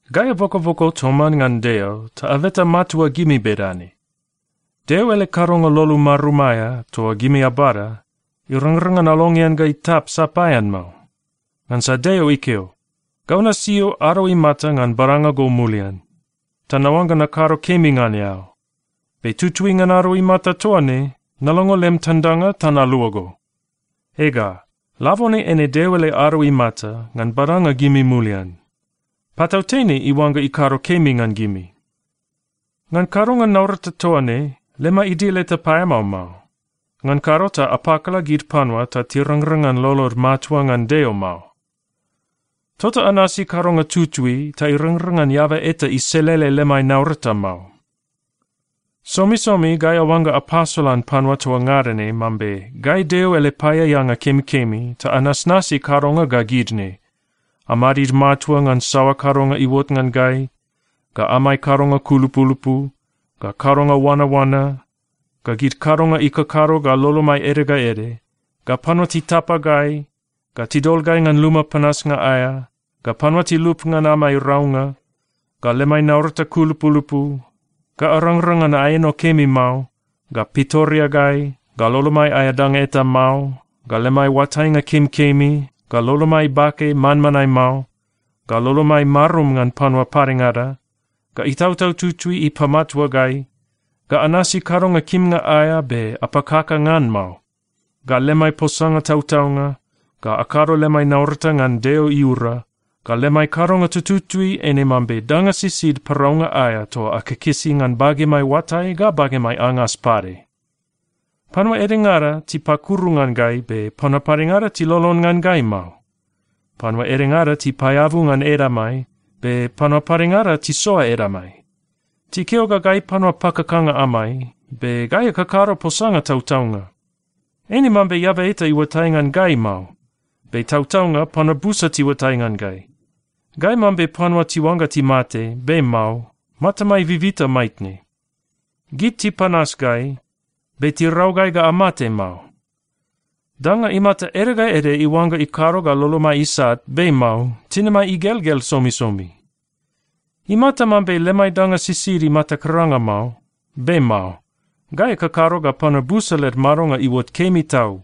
Gai abokoboko toman ngan Deo ta abeta matua gimi bedane: Deo ele kadonga lolo marum aea toa gimi abada, irangrang ngan alongean ga itap sapaean mao. Ngansa Deo ikeo, “Gau nasio ado imata ngan badanga go mulian, ta naoangga nakado kemi ngan eao. Be tutui ngan ado imata toa ne, nalongo lem tandanga ta nalua go.” Ega, labone eine Deo ele ado imata ngan badanga gimi mulian. Patautene iuangga ikado kemi ngan gimi. Ngan kadonga naurata toa ne, lemai idil eta paeamao mao. Ngan kado ta apakala gid panua ta tirangrang ngan lolod matua ngan Deo mao. Tota anasi kadonga tutui ta irangrang ngan eaba eta iselele lemai naurata mao. Somisomi gai aoangga apasolan panua toa ngada ne mambe gai Deo ele paeaeanga kemikemi ta anasnasi kadonga ga gid ne: Amadid matua ngan saoa kadonga iuot ngan gai, ga amai kadonga kulupulupu, ga kadonga oanaoana, ga gid kadonga ikakado ga lolomai ede ga ede, ga panua titapa gai, ga tidol gai ngan luma panasnga aea, ga panua tilup ngan amai raunga, ga lemai naurata kulupulupu, ga arangrang ngan aeno kemi mao, ga pitoreagai, ga lolomai aea danga eta mao, ga lemai oatainga kemikemi, ga lolomai bake manmanae mao, ga lolomai marum ngan panua padengada, ga Itautau Tutui ipamatua gai, ga anasi kadonga kimnga aea be apakaka ngan mao, ga lemai posanga tautaunga, ga akado lemai naurata ngan Deo iura, ga lemai kadonga tututui eine mambe danga sisid paraunga aea toa akikisi ngan bagemai oatai ga bagemai angas pade. Panua edengada tipakuru ngan gai, be panua padengada tilolon ngan gai mao. Panua edengada tipaeabu ngan edamai, be panua padengada tisoa edamai. Tikeo ga gai panua pakakanga amai, be gai akakado posanga tautaunga. Eine mambe eaba eta iuatai ngan gai mao, be tautaunga panua busa tiuatai ngan gai. Gai mambe panua tiuangga timate, be mao. Matamai bibita maitne. Gid tipanas gai, be tirau gai ga amate mao. Danga imata ede ga ede iuangga ikado ga lolomai isat, be mao. Tinimai igelgel somisomi. Imata mambe lemai danga sisid imata karanga mao, be mao. Gai akakado ga panua busa led madonga iuot kemi tau.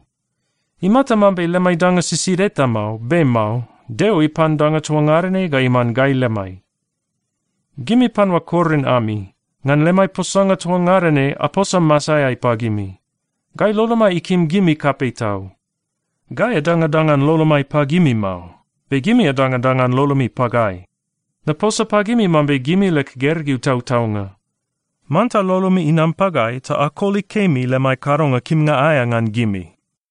Imata mambe lemai danga sisid eta mao, be mao. Deo ipan danga toa ngada ne ga iman gai lemai. Gimi panua Korin ami, ngan gai lemai posanga toa ngada ne, aposa masaeai pagimi. Gai lolomai ikim gimi kapei tau. Gai adangadangan lolomai pagimi mao. Be gimi adangadangan lolomi pagai. Naposa pagimi mambe gimi leg gergeu tautaunga, manta lolomi inam pagai ta akoli kemi lemai kadonga kimnga aea ngan gimi.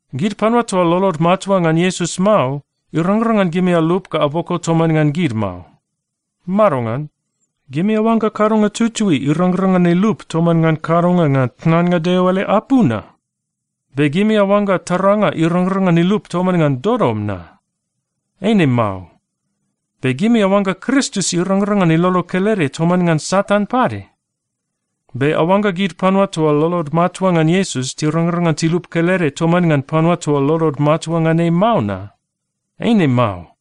Gid panua toa lolod matua ngan Iesus mao, irangrang ngan gimi alup ga aboko toman ngan gid mao. Madongan? Gimi aoangga kadonga tutui irangrang ngan ilup toman ngan kadonga ngan tnannga Deo ele apu na? Be gimi aoangga taranga irangrang ngan ilup toman ngan dodom na? Eine mao. Be gimi aoangga Kristus irangrang ngan ilolo kelede toman ngan Satan pade? Be aoangga gid panua toa lolod matua ngan Iesus tirangrang ngan tilup kelede toman ngan panua toa lolod matua ngan ei mao na? Eine mao.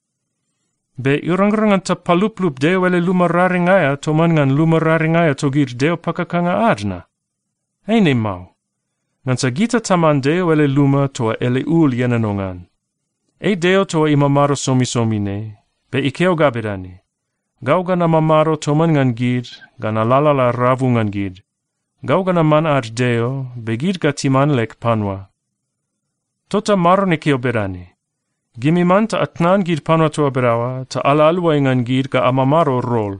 Be irangrang ngan tapaluplup Deo ele luma raring aea toman ngan luma raring aea togid deo pakakanga ad na? Eine mao, ngansa gita taman Deo ele luma toa ele ul ienono ngan. Ei Deo toa imamado somisomi ne, be ikeo ga bedane, “Gau ga namamado toman ngan gid ga nalalala rabu ngan gid. Gau ga naman ad Deo, be gid ga timan leg panua.” Tota Maron ikeo bedane, “Gimi manta atnan gid panua toa bedaoa ta ala aluai ngan gid ga amamado rol.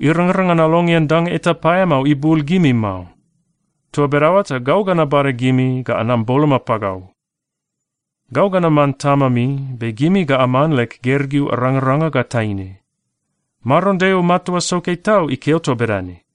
Irangrang ngan alongean danga eta paeamao ibul gimi mao. Toa bedaoa ta gau ga nabada gimi ga anam boloma pagau.” “Gau ga naman Tamami, be gimi ga aman leg gergeu arangaranga ga taine. Maron Deo Matua Soke Tau ikeo toa bedane.”